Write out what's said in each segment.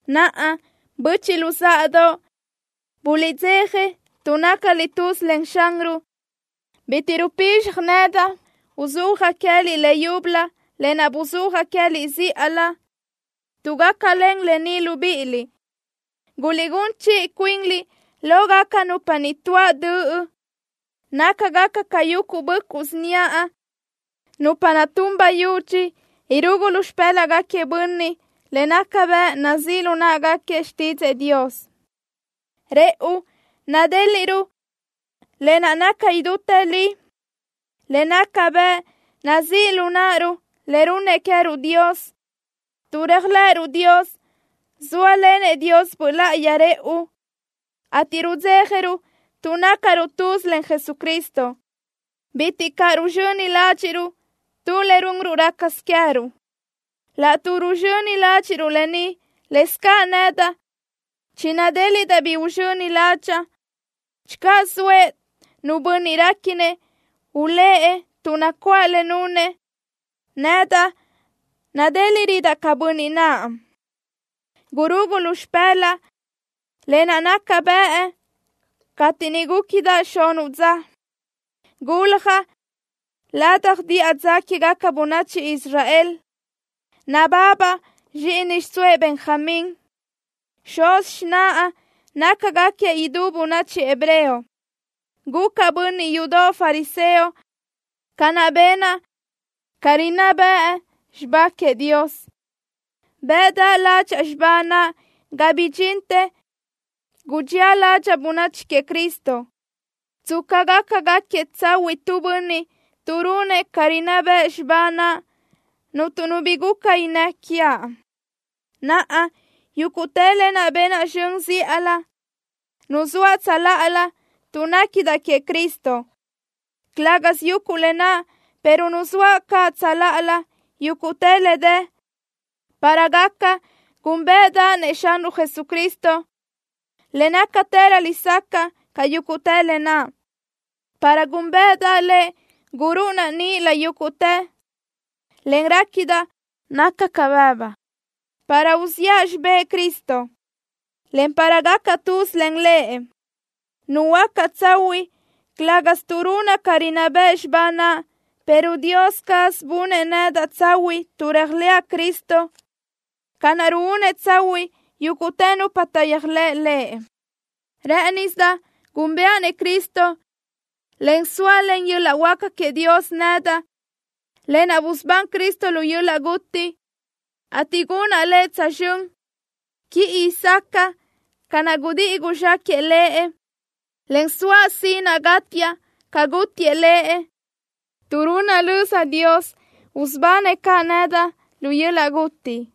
¡Naʼa, böchiʼ luzáʼadoʼ, buliʼdzeja tuʼ nácaliʼ tuz len Xanruʼ! Bitiʼ rupizxaj nedaʼ uzúajaʼ queë́liʼ leyúbölö lë naʼ buzúajaʼ queë́liʼ zíʼalö, tuʼ gácalen lë ni libíʼiliʼ. Guliʼgún chiʼi cuinliʼ lógaca nupa niʼ tuáʼ döʼ. Nácagaca ca yuguʼ böʼcuʼ síniaʼ, nupa naʼ tun bayudxi irugu lu xipë́laʼgaquiëʼ bönniʼ le naca bëʼ nazíʼ lu náʼgaquiëʼ xtídzëʼë Dios. Rëʼu nadéliʼruʼ lë naʼ naca idútë li, le naca bëʼ nazíʼ lu náʼaruʼ le runnëʼ queë́ruʼ Dios. Tuʼ réajlëʼëruʼ Dios, zóalenëʼ Dios Böʼ Láʼayi rëʼu, ateʼ rudzéjaruʼ tuʼ nácaruʼ tuz len Jesucristo. Bitiʼ caʼ ruzxöni ládxiʼruʼ tu le runruʼ rácasö queë́ruʼ. Laʼtuʼ ruzxöni ládxiʼruʼ lë ni, lëscaʼ nedaʼ chinadéliʼdaʼ bi uzxöni ládxaʼa. Channö zoëʼ nu bönniʼ réquinëʼ ulë́ʼ tuʼ nacuáʼ le nunëʼ, nedaʼ nadéliʼrödaʼ ca bönniʼ naʼ: Gurugu lu xipë́laʼa lë naʼ naca bëʼ cateʼ niʼ gúquidaʼ xunuʼ dza. Guljaʼ ladaj diʼa dza quégaca bönachi Israel. Nababaʼ zxíʼini xiʼsóëʼ Benjamín. Xuz xináʼa nácagaquiëʼ idú bönachi hebreo. Gucaʼ bönniʼ yudoʼ fariseo ca naʼ benaʼ ca rinná bëʼ xibá queëʼ Dios. Bëʼdaʼ ládxaʼa xibá naʼ ga bidxintë gudxía ládxaʼa bönachi queëʼ Cristo. Tsca gaca gáquiëʼ tsahuiʼ tu bönniʼ tuʼ runëʼ ca rinná bëʼ xibá naʼ, cuntu nu bi guca innë́ quiaʼ. Naʼa, yúguʼtë lë naʼ benaʼ zxön zíʼalö, nuzóaʼ tsöláʼalö tuʼ néquidaʼ queëʼ Cristo. Calë́gasö yuguʼ lë naʼ, pero nuzóaʼ caʼ tsöláʼalö yúguʼtë le dë, para gaca gúnbeʼedaʼ-nëʼ Xanruʼ Jesucristo, le nácatërö lesacaʼ ca yúguʼtë lë naʼ. Para gúnbeʼedaʼ Lëʼ gurúʼunaʼ níʼilö yúguʼtë, en réquidaʼ naca ca bëbu, para uziʼa xibë́ʼ Cristo, en para gacaʼ tuz len Lëʼ. Nuhuöácaʼ tsahuiʼ, calëga tuʼ runaʼ ca rinná bëʼ xibá naʼ, pero Dios caz bunëʼ nedaʼ tsahuiʼ tuʼ réajlëʼa Cristo, ca naʼ ruúnëʼ tsahuiʼ yúguʼtë nupa taʼyéajlëʼ Lëʼ. Rë́ʼënisidaʼ gúnbëʼa-nëʼ Cristo, en sóalen yöl-laʼ huáca queëʼ Dios nedaʼ, lë naʼ busubán Cristo lu yöl-laʼ guti, ateʼ gunaʼ Lëʼ tsözxö́n, quiʼi sacaʼa ca naʼ gudíʼi guzxáquëʼë Lëʼ, en soaʼ sinaʼ gátiaʼ ca gútiëʼ Lëʼ, tuʼ runaʼ löza Dios, usubanëʼ caʼ nedaʼ lu yöl-laʼ guti.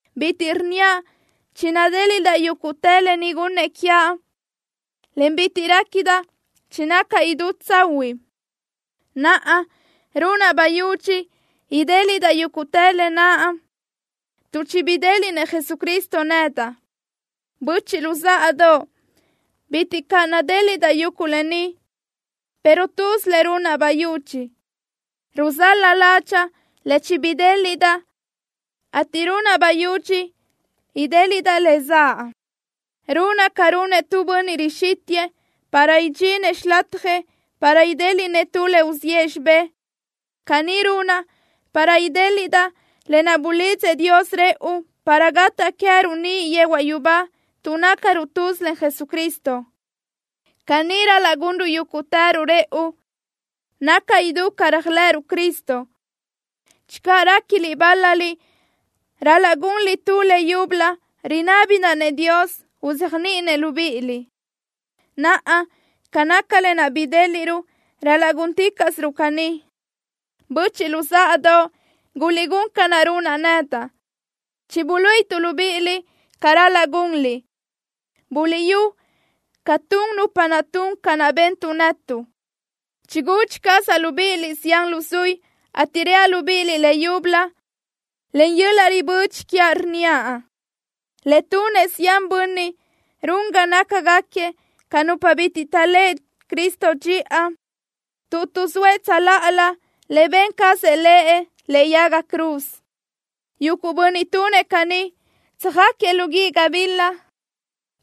Bitiʼ rnníaʼ chinadéliʼdaʼ yúguʼtë lë ni gunnëʼ quiaʼ, en bitiʼ réquidaʼ chinacaʼ idú tsahuiʼ. Naʼa, runaʼ bayudxi idéliʼdaʼ yúguʼtë lë naʼ, tuʼ chibidéliʼnëʼ Jesucristo nedaʼ. Böchiʼ luzáʼadoʼ, bitiʼ caʼ nadéliʼdaʼ yuguʼ lë ni, pero tuz le runaʼ bayudxi. Ruzál-la ládxaʼa le chibidéliʼdaʼ, ateʼ runaʼ bayudxi idéliʼdaʼ le zaʼ. Runaʼ ca runëʼ tu bönniʼ rixítiʼdëʼë para idxinëʼ xilatjëʼ para idéliʼnëʼ tu le uziʼë xibé. Caní runaʼ para idéliʼdaʼ lë naʼ bulidzëʼ Dios rëʼu para gataʼ queë́ruʼ niʼ yehuaʼ yubá tuʼ nácaruʼ tuz len Jesucristo. Caní ral-laʼ gunruʼ yúguʼtëruʼ rëʼu, naca idú ca réajlëʼëruʼ Cristo. Channö réquiliʼ bál-laliʼ ral-laʼ gunliʼ tu le yúbölö, rinábidaʼ-nëʼ Dios uzéajniʼinëʼ libíʼiliʼ. Naʼa, ca naca lë naʼ bidéliʼruʼ, ral-laʼ gúnticaʼsiruʼ caní. Böchiʼ luzáʼadoʼ, guliʼgún ca naʼ runaʼ nedaʼ. Chibuluíʼituʼ libíʼiliʼ ca ral-laʼ gunliʼ. Buliʼyú ca tun nupa naʼ tun ca naʼ bentuʼ netuʼ. Chigudxi cazaʼ libíʼiliʼ zián luzuí, ateʼ reaʼ libíʼiliʼ leyúbölö len yöl-laʼ ribödxi quiaʼ, rnníaʼ: Le tunëʼ zián bönniʼ run ga nácagaquiëʼ ca nupa bitiʼ taʼléʼe Cristo dxiʼa, tuʼ tuʼzóëʼ tsöláʼalö le ben cazëʼ Lëʼ lëʼe yaga cruz. Yuguʼ bönniʼ tunëʼ caní, tsöjáquiëʼ lu guíʼ gabila,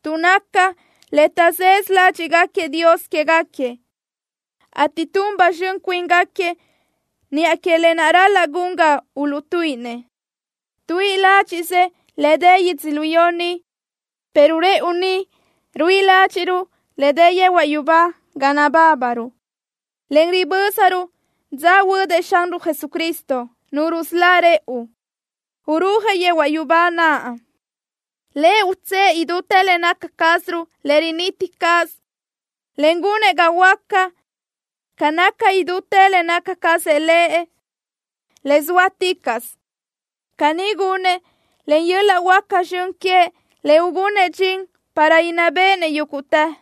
tuʼ naca le taʼzësö ládxiʼgaquiëʼ dios quégaquiëʼ, ateʼ tun ba zxön cuíngaquiëʼ niʼa que lë naʼ ral-laʼ gun ga uluʼtuíʼinëʼ. Tuíʼi ládxiʼsë le dë yödzölió ni, pero rëʼu ni ruíʼi ládxiʼruʼ le dë yehuaʼ yubá ga nabábaruʼ, en ribö́zaruʼ dza huödëʼ Xanruʼ Jesucristo, Nu rusölá rëʼu, urúajëʼ yehuaʼ yubá naʼ. Lëʼ utsë́ʼë idútë le naca cázaruʼ, le riniti caz, en gunëʼ ga huöáca ca naca idútë le naca cazëʼ Lëʼ, le sóaticaʼsö. Caní gunëʼ len yöl-laʼ huáca zxön queëʼ le ugunëʼ dxin para inná béʼenëʼ yúguʼtë.